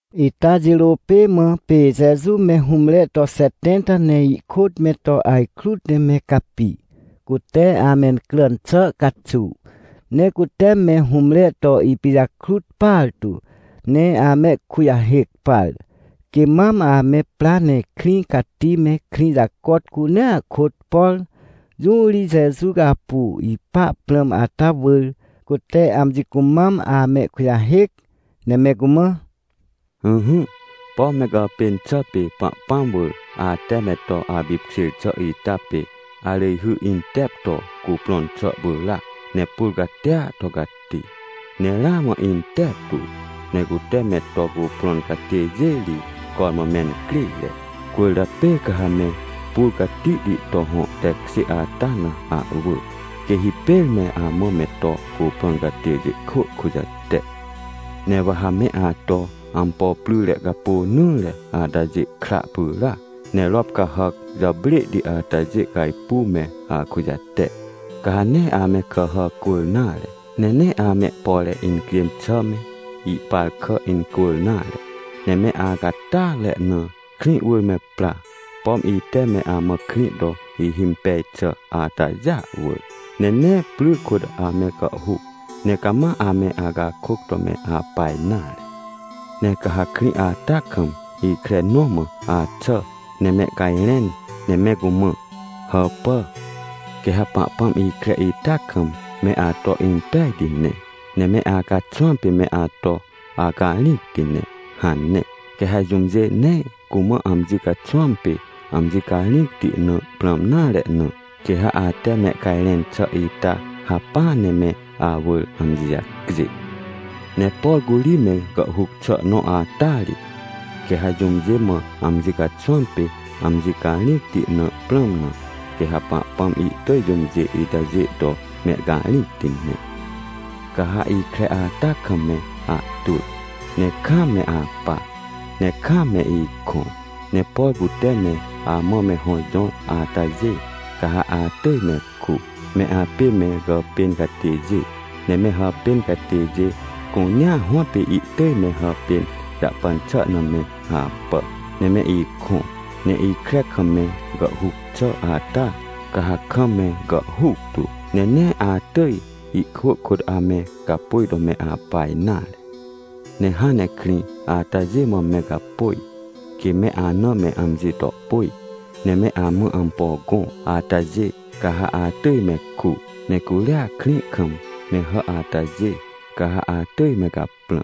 Ita jirô pê mã pê Jeju me hũmre to xetẽnta ne ihkôt me to ajkrut ne me capi, cute amencràn xà caxuw. Ne cute me hũmre to ipijakrut partu ne amehkujahêc par, quê mam ame pra ne krĩ cati me krĩ jacot cunea kôt, por jũ ri Jeju apu ipa prãm ata wỳr, cute amji cumam amehkujahêc. Ne me cumã: ― Ỹhỹ, pom me gàpên xà pê Pahpãm wỳr ate me to apipkjêr xà ita pê arỳjhy intep to cuprõn xà pyràac. Ne pur catia to cati, ne ramã inteptu, ne cute me to cuprõn catêjê ri cormã mencrêre. Cwỳrjapê ca ha me pur catihti to hõ tekjê ata na ahwỳ, quê hipêr me amã me to cuprõn catêjê kwỳ kujate. Ne wa ha me ato ampo pryre capônỹre atajê kra pyràac, ne rop cahàc jàprêhti atajê cajpuw me akujate. Ca ha nee ame kàhà cwỳr nare, ne nee amehpore incjên xà me, ihpar kà incwỳr nare. Ne me acatyatre na krĩ wỳr me pra, pom ite me amã krĩ to ihimpej xà atajêa wỳr. Ne nee pry kôt ame gàhhuc, ne cama ame acakôc to me apa nare. ― Ne ca ha krĩ ata kam ikre nõ mã axà, ne mehcajrẽn, ne me cumã: “Hàpà, quê ha Pahpãm ikre ita kam me ato impejti ne, ne me acaxwãm pê me ato acarĩcti ne” hane. Quê ha jũmjê nee cumã amji caxwãm pê amji carĩcti na prãm nare na, quê ha ate mehcajrẽn xà ita hacpỹa ne me awỳr amji jacjê. Ne por curi me gàhhuc xà nõ ata ri, quê ha jũmjê mã amji caxwãm pê amji carĩcti na prãm na, quê ha Pahpãm ihtỳj jũmjê itajê to mehcarĩcti ne. Ca ha ikre ata kam me ahtwỳ, ne kaam me apà, ne kaam me ikõ, ne por cute me amã me hõ jõr atajê, ca ha atỳj me ku. Me apê me gàpên catêjê, ne me hàpên catêjê cunea hõtpê ihtỳj me hàpên jahpan xà na me apà, ne me ikõ. Ne ikre kam me gàhhuc xà ata ca ha kam me gàhhuc tu, ne nee atỳj ihkwỳ kôt ame gapôj to me apa nare. ― Ne hãn ne krĩ atajê mã me gapôj, quê me ana me amji to pôj, ne me amã ampo gõ atajê, ca ha atỳj me ku. Ne curia krĩ kam me hà atajê, ca ha atỳj me caprã,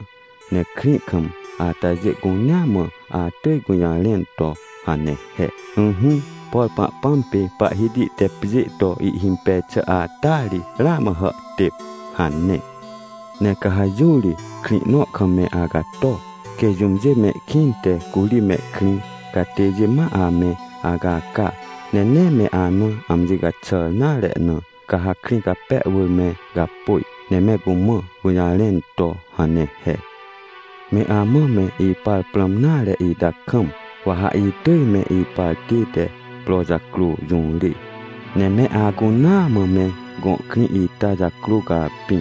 ne krĩ kam atajê cunea mã atỳj gũjarẽn to hane he: “Ỹhỹ, por Pahpãm pê Pahhiti te pjê to ihhimpej xà ata ri, ramã hàhtêp” hane. Ne ca ha jũ ri krĩ nõ kam me acato, quê jũmjê mehkĩnte curi mehkrĩ catêjê ma ame acaca, ne nee me ana amji caxàr nare na, ca ha krĩ cape wỳr me gapôj, ne me cumã gũjarẽn to hane he: “Me amã me ipar prãm nare ita kam, wa ha itỳj me ipar tête pro jacrô jũrê, ne me acunaa mã me gõ krĩ ita jacrô capĩ.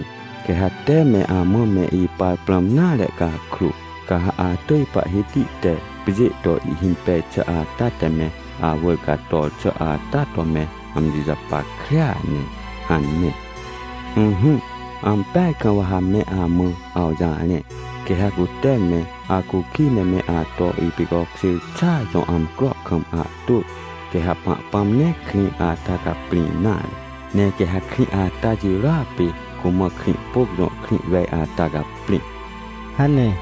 Quê ha te me amã me ipar prãm nare cakrô, ca ha atỳj Pahhiti te pjê to ihhimpej xà ata te me awỳr cator xà ata to me amji japackrea ne” hane. ― Ỹhỹ, ampeaj kam wa ha me amã awjarẽ, quê ha cute me acukij ne me ato ipicokjêr xàa jõ amcro kam ahtwỳ, quê ha Pahpãm nee krĩ ata caprĩ nare. Ne quê ha krĩ ata jirôa pê cumã Krĩhpôc jõ krĩ wej ata caprĩ ― hane.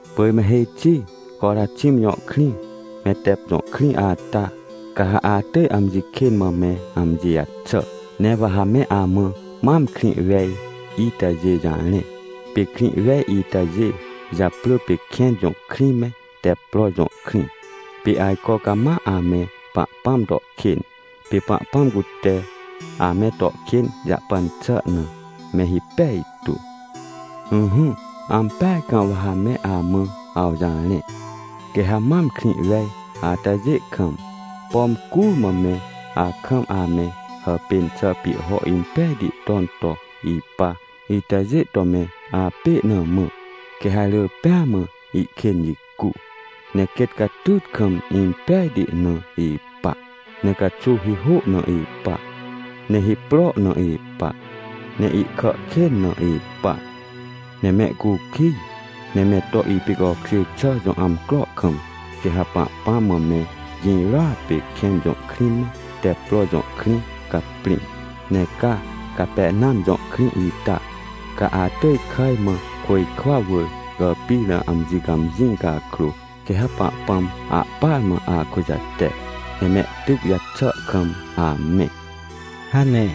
― Pỳj me hêj xi Coraxim jõ krĩ, me Tep jõ krĩ ata, ca ha atỳj amji kên mã me amji jaxà. Ne wa ha me amã mam krĩ wej itajê jarẽ. Pê krĩ wej itajê japrỳ pê Kẽn jõ krĩ me Teppro jõ krĩ. Pê ajco cama ame Pahpãm to kên, pê Pahpãm cute ame to kên jahpan xà na, me hipej tu. Ỹhỹ, ampeaj kam wa ha me amã awjarẽ, quê ha mam krĩ wej atajê kam, pom curmã me akam ame hàpên xà pihho impejti ton to ipa itajê to me apê na mã, quê ha rỳ pêa mã ihkên jicu, ne quêt catyt kam, impejti na ipa, ne caxuw hihô na ipa, ne hipro na ipa, ne ihkà kên na ipa. Ne mehcukij ne me to ipicokjêr xà jõ amcro kam, quê ha Pahpãm mã me girôa pê Kẽn jõ krĩ me, Teppro jõ krĩ caprĩ. Ne ca Capernam jõ krĩ ita, ca atỳj kàj mã, côjkwa wỳr gàpir na amji cãmjĩ cakrô, quê ha Pahpãm ahpar mã akujate, ne mehtyc jaxà kam amẽ ― hane.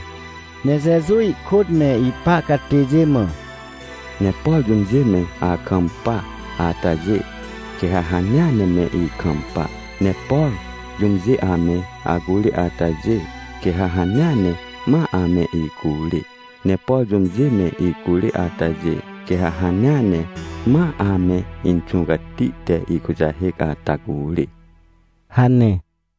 Ne Jeju ihkôt me ipa catêjê mã: ― Ne por jũmjê me akampa atajê, quê ha hanea ne me ikampa, ne por jũmjê ame acurê atajê, quê ha hanea ne ma ame icurê. Ne por jũmjê me icurê atajê, quê ha hanea ne ma ame Inxũ Cati te ikujahêc ata curê ― hane.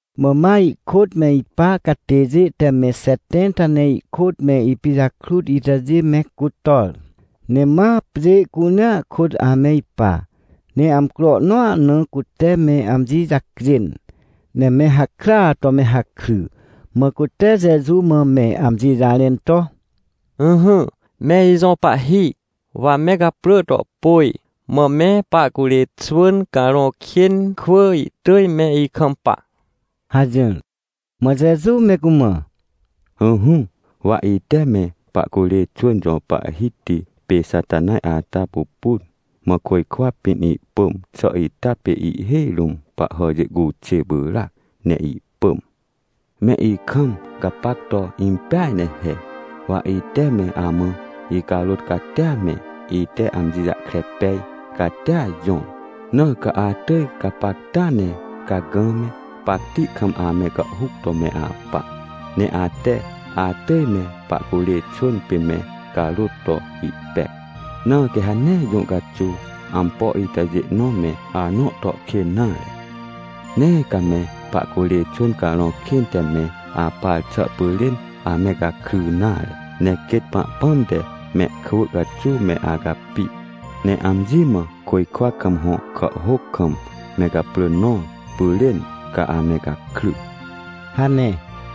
Mã ma ihkôt me ipa catêjê te me xetẽnta ne ihkôt me ipijakrut itajê me cutor, ne ma pjê cunea kôt ame ipa. Ne amcro nõa na cute me amji jacjên, ne me hakrya to me hakry, mã cute Jeju mã me amji jarẽn to: ― Ỹhỹ, me ijõ Pahhi, wa me gaprỳ to pôj, mã me pahcurê xwỳn carõ kên kwỳ ihtỳj me ikampa ― hajỹr. Mã Jeju me cumã: ― Ỹhỹ, wa ite me pahcurê xwỳn jõ pahhiti pê Xatanaj ata pupun. Mã côjkwa pĩn ihpỳm xà ita pê ihhêj rũm pahhàjê cuxê pyràac ne ihpỳm. Me ikam gapac to impeaj ne he. Wa ite me amã icarôt catia me, ite amji jahkre pej catia jõr, na ca atỳj gapacta ne cagã me, pacti kam ame gàhhuc to me apa, ne ate atỳj me pahcurê xwỳn pê me carôt to ihpec. Na quê ha nee jũ caxuw ampo itajê nõ me anõ to kên nare. Nee ca me pahcurê xwỳn carõ kên te me apar xà pyrên ame gakry nare. Ne quêt Pahpãm te mehkwỳ caxuw me acapi, ne amji mã côjkwa kam hõ kàhhôc kam me gaprỳ nõr pyrên, ca ame gakry ― hane.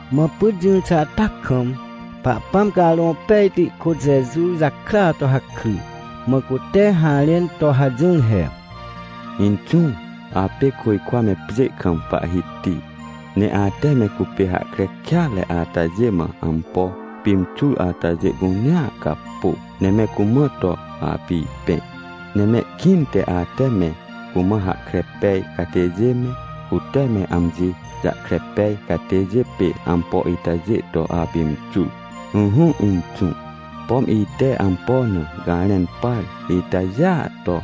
Mã pyt jỹr xà ata kam, Pahpãm Carõ Pejti kôt Jeju jakrya to hakry, mã cute harẽn to hajỹr he: ― Inxũ, apê côjkwa me pjê kam Pahhiti. Ne ate me cupê hahkre kêatre atajê mã ampo pimxur atajê cunea capô, ne me cumã to apipẽ. Ne mehkĩnte ate me cumã hahkre pej catêjê me, cute me amji jahkre pej catêjê pê ampo itajê to apimxur. Ỹhỹ Inxũ, pom ite ampo na garẽn par itajêa to,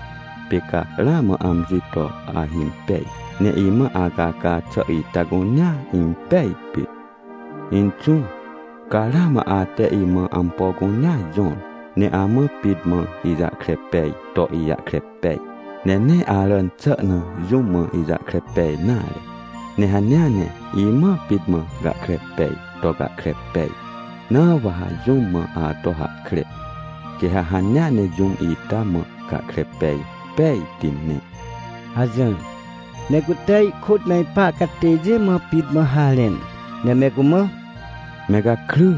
pê ca ramã amji to ahimpej. Ne imã acaca xà ita cunea impej pit. ― Inxũ, ca ramã ate imã ampo cunea jõr. Ne amã pit mã ijahkre peaj to ijahkre pej, ne nee aràn xà na jũm mã ijahkre pej nare. Ne hanea ne imã pit mã gahkre peaj to gahkre pej. Na wa ha jũm mã ato hahkre, quê ha hanea ne jũm ita mã gahkre pej pejti ne ― hajỹr. Ne cute ihkôt me ipa catêjê mã pit mã harẽn, ne me cumã: ― Me gakry,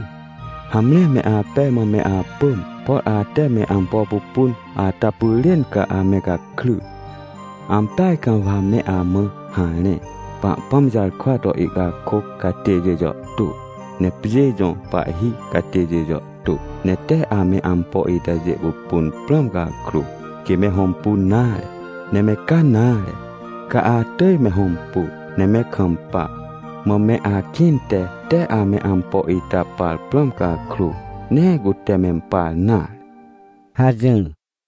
hamre me apej mã me apỳm. Por ate me ampo pupun ata pyrên ca ame gakry. Ampeaj kam wa me amã harẽ, Pahpãm jarkwa to ihcakôc catêjê jàhtô, ne pjê jõ pahhi catêjê jàhtô, ne tee ame ampo itajê pupun prãm cakrô, quê me hõmpun nare. Ne me ca nare, ca atỳj me hõmpu ne me kampa. Mã me akĩnte tee ame ampo ita par prãm cakrô, nee cute mempar nare ― hajỹr.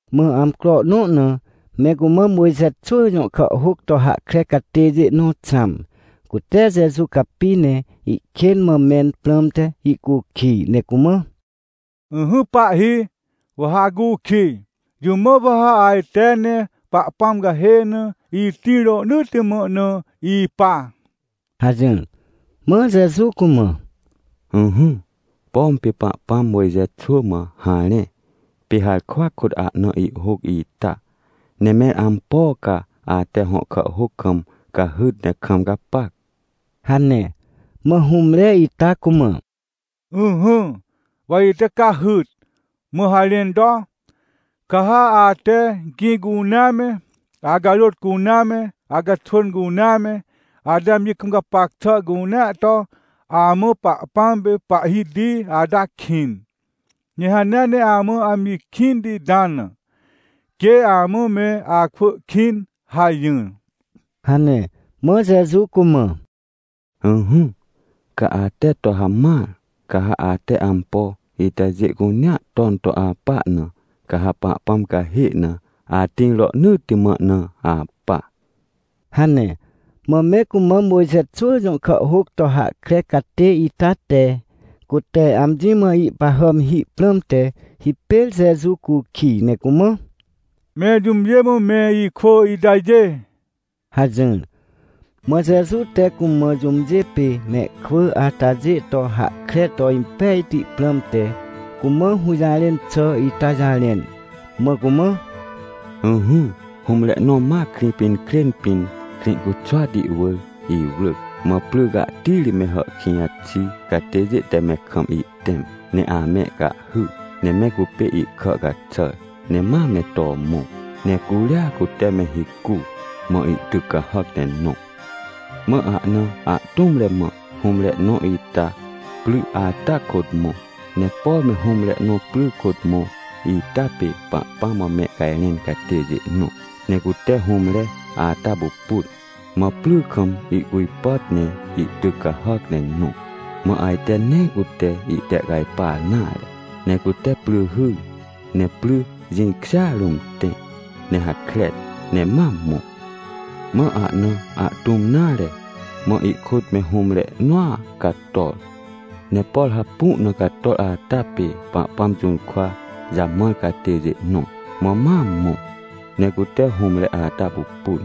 Mã amcro nõ na me cumã Mojxe xwỳ jõ kàhhôc to hahkre catêjê nõ xãm, cute Jeju capi ne ihkên mã mẽn prãmte ihcukij, ne cumã: ― Ỹhỹ, Pahhi, wa ha acukij, jũ mã wa ha ajte ne Pahpãm cahê na itĩr rohnỳtti mã na ipa? ― hajỹr. Mã Jeju cumã: ― Ỹhỹ, pom pê Pahpãm Mojxe xwỳ mã harẽ, pê harkwa kôt ahna ihhôc ita? Ne mẽr ampo ca ate hõ kàhhôc kam cahyt ne kam gapac? ― hane. Mã hũmre ita cumã: ― Ỹhỹ, wa ite cahyt, mã harẽn to: “Ca ha ate gĩ cunea me, acarôt cunea me, acaxwỳn cunea me, ate amji kam gapac xà cunea to, amã Pahpãm pê Pahhiti ata ihkĩn. Ne hanea ne amã amji kĩnti ita na, quê amã me akwỳ kĩn” hajỹr ― hane. Mã Jeju cumã: ― Ỹhỹ, ca ate to hamãr, ca ha ate ampo itajê cunea ton to apa na, ca ha Pahpãm cahê na atĩr rohnỳtti mã na apa ― hane. Mã me cumã Mojxe xwỳ jõ kàhhôc to hahkre catê ita te cute amji mã ihpahàm hi prãmte, hipêr Jeju cukij, ne cumã: ― Mẽr jũmjê mã me ikwỳ itajê? ― hajỹr. Mã Jeju te cumã jũmjê pê mehkwỳ atajê to hahkre to impejti prãmte, cumã hũjarẽn xà ita jarẽn, mã cumã: ― Ỹhỹ, hũmre nõ ma Krĩpinkrên pĩn, Krĩcuxwati wỳr iwrỳc. Mã pry cahtiri me hàhkĩj xi catêjê te me kam ihtẽm, ne amehcahhy, ne me cupê ihkà caxàr, ne ma me to mõ. Ne curia cute me hicu mã ihtyc cahàc ne nõ. ― Mã ahna ahtũmre mã hũmre nõ ita pry ata kôt mõ, ne por me hũmre nõ pry kôt mõ ita pê Pahpãm mã mehcajrẽn catêjê nõ. Ne cute hũmre ata pupun, mã pry kam ihcujpàt ne ihtyc cahàc ne nõ. Mã ajte nee cute ihtehcajpar nare, ne cute pry hyr, ne pry jĩkjêa rũm tẽ ne hakren, ne ma mõ. ― Mã ahna ahtũm nare, mã ihkôt me hũmre nõa cator. Ne por hapu na cator ata pê Pahpãm jũrkwa jamãr catêjê nõ. Mã ma mõ ne cute hũmre ata pupun,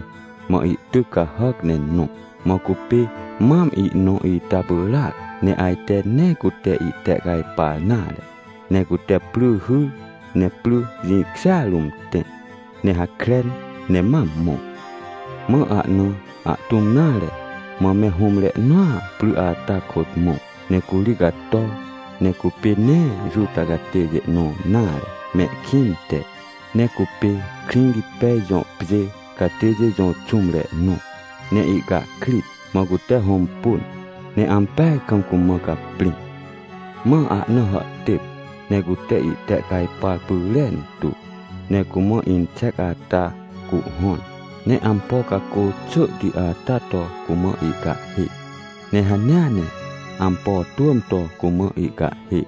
mã ihtyc cahàc ne nõ. Mã cupê mam ihnõ ita pyràac, ne ajte nee cute ihtehcajpar nare, ne cute pry hyr, ne pry jĩkjêa rũm tẽ ne hakren, ne ma mõ. ― Mã ahna ahtũm nare, mã me hũmre nõa pry ata kôt mõ, ne curi cator. Ne cupê nee Juta catêjê nõ nare mehkĩnte, ne cupê Krĩrĩtpej jõ pjê catêjê jõ xũmre nõ, ne ihcahkrit. Mã cute hõmpun, ne ampeaj kam cumã caprĩ. Mã ahna hàhtêp, ne cute ihtehcajpar pyrentu. Ne cumã inxec ata cuhhõn, ne ampo cacô xỳhti ata to cumã ihcahhê. Ne hanea ne ampo twỳm to cumã ihcahhê,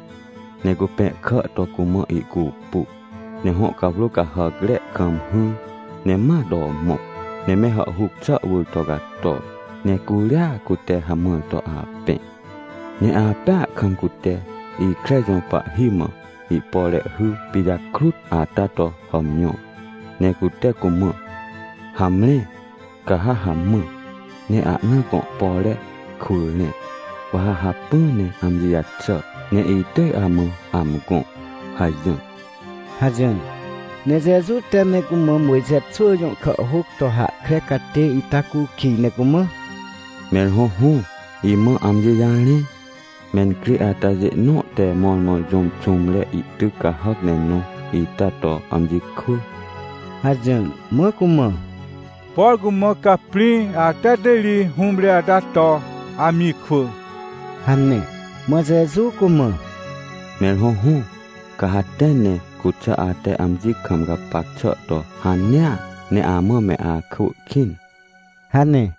ne cupẽhkà to cumã ihcupu, ne hõ cawrô cahàcre kam hỹr, ne ma to mõ. Ne me hàhhuc xà wỳr to cator, ne curia cute hamãr to apẽ. ― Ne apẽa kam, cute ikre jõ pahhi mã ihpore hy pijakrut ata to hàmjõr, ne cute cumã: “Hamre, ca ha hamã, ne ahna gõ pore kwỳ rẽ, wa ha hacpỹ ne amji jaxà, ne itỳj amã amgõ” hajỹr ― hajỹr. Ne Jeju te me cumã Mojxe xwỳ jõ kàhhôc to hahkre catê ita cukij ne cumã: ― Mẽr hõhõ, imã amji jarẽ, mencrê atajê nõ te mõrmõ jũm xũmre ihtyc cahàc ne nõ ita to amji kwỳ? ― hajỹr. Mã cumã: ― Por cumã caprĩ ata te ri hũmre ata to amji kwỳ ― hane. Mã Jeju cumã: ― Mẽr hõhõ, ca ha tẽ, ne cuxà ate amji kam gapac xà to hanea, ne amã me akwỳ kĩn ― hane.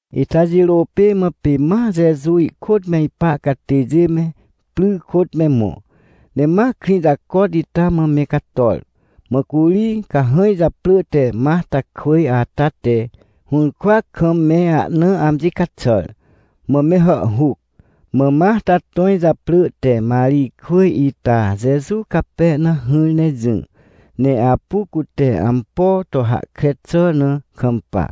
Ita jirô pê mã pê ma Jeju ihkôt me ipa catêjê me pry kôt me mõ, ne ma krĩ jacot ita mã me cator. Mã curi cahãj japrỳ te Martakwỳj ata te hũrkwa kam me ahna amji caxàr, mã me hàhhuc. Mã Marta tõj japrỳ te Marijkwỳj ita Jeju cape na hỹr ne jỹ, ne apu cute ampo to hahkre xà na kampa.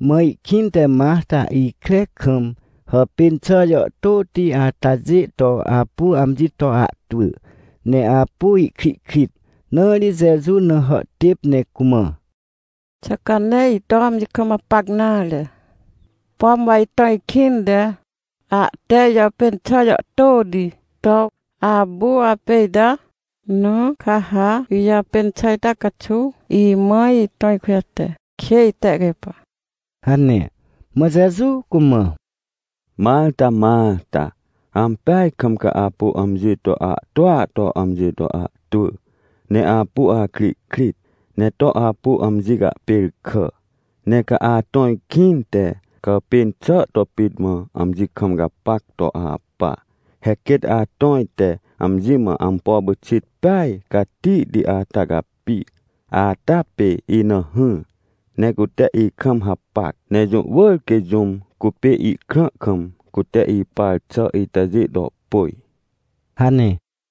Mã ihkĩnte Marta ikre kam hàpên xà jàhtôti atajê to apu amji to ahtwỳ, ne apu ihkrihkrit, na ri Jeju na hàhtêp ne cumã: ― Xà ca nee ito amji kam gapac nare, pom wa itõj kĩnte ahte ijàpên xà jàhtôti to apu apê ita? Na ca ha ijàpên xà ita caxuw imã itõj kujate, quê itehcajpa ― hane. Mã Jeju cumã: ― Marta, Marta, ampeaj kam ca apu amji to ahtwỳa to amji to ahtwỳ, ne apu akrihkrit, ne to apu amji cahpêrkà. Ne ca atõj kĩnte, gàpên xà to pit mã amji kam gapac to apa. He quêt atõj te amji mã ampo pyxit peaj catihti ata capi ata pê ina hỹr, ne cute ikam hapac. Ne jũ wỳr quê jũm cupê ihkrã kam, cute ipar xà itajê to pôj ― hane.